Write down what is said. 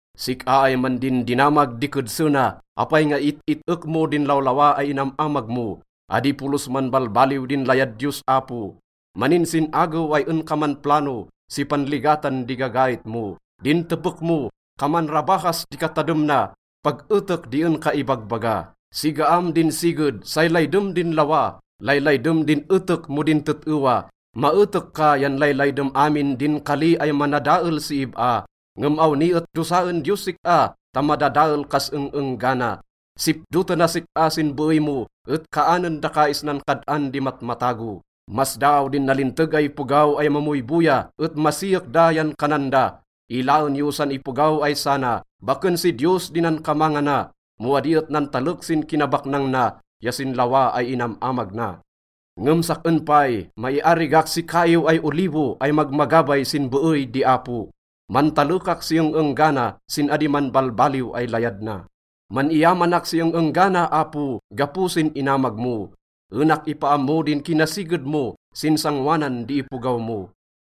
Sik-a ay mandindinamag di kedse na, apay nga it-it-ek mo din lawlawa ay inam-amag mo? Adi polos manbalbaliw din layad Diyos Apo. Maninsin-agew ay en ka manplano si panligatan di gagait mo. Din tepek mo, kaman rabahas di katadem na, pag etek di en ka ibagbaga. Sigaam din siged, say laydem din lawa. Laylaydem din etek mo din tet-ewa. Maetek ka yan laylaydem amin din kali ay manadael si ib-a. Ngem awni et dosaen Diyos sik-a ta madadael kas eng-enggana. Sipdotenas sik-a sin beey mo, et kaanen daka isnan kad-an di matmatago. Masdaaw din nalinteg ay ipogaw ay mamoyboya et masiyek da yan kanan da, “Ilaen yo san ipogaw ay sana. Baken si Diyos di nankamangana mo adi et nantalek sin kinabaknang na ya sin lawa ay inam-amag na.” Ngem sak-en pay, maiarigak si kaiw ay olivo ay magmagabay sin beey di Apo. Mantalekak si eng-enggana sin adi manbalbaliw ay layad na. Man-iyamanak si eng-enggana, Apo, gapo sin inamag mo. Enak ipaammo din kinasiged mo sin sangoanan di ipogaw mo.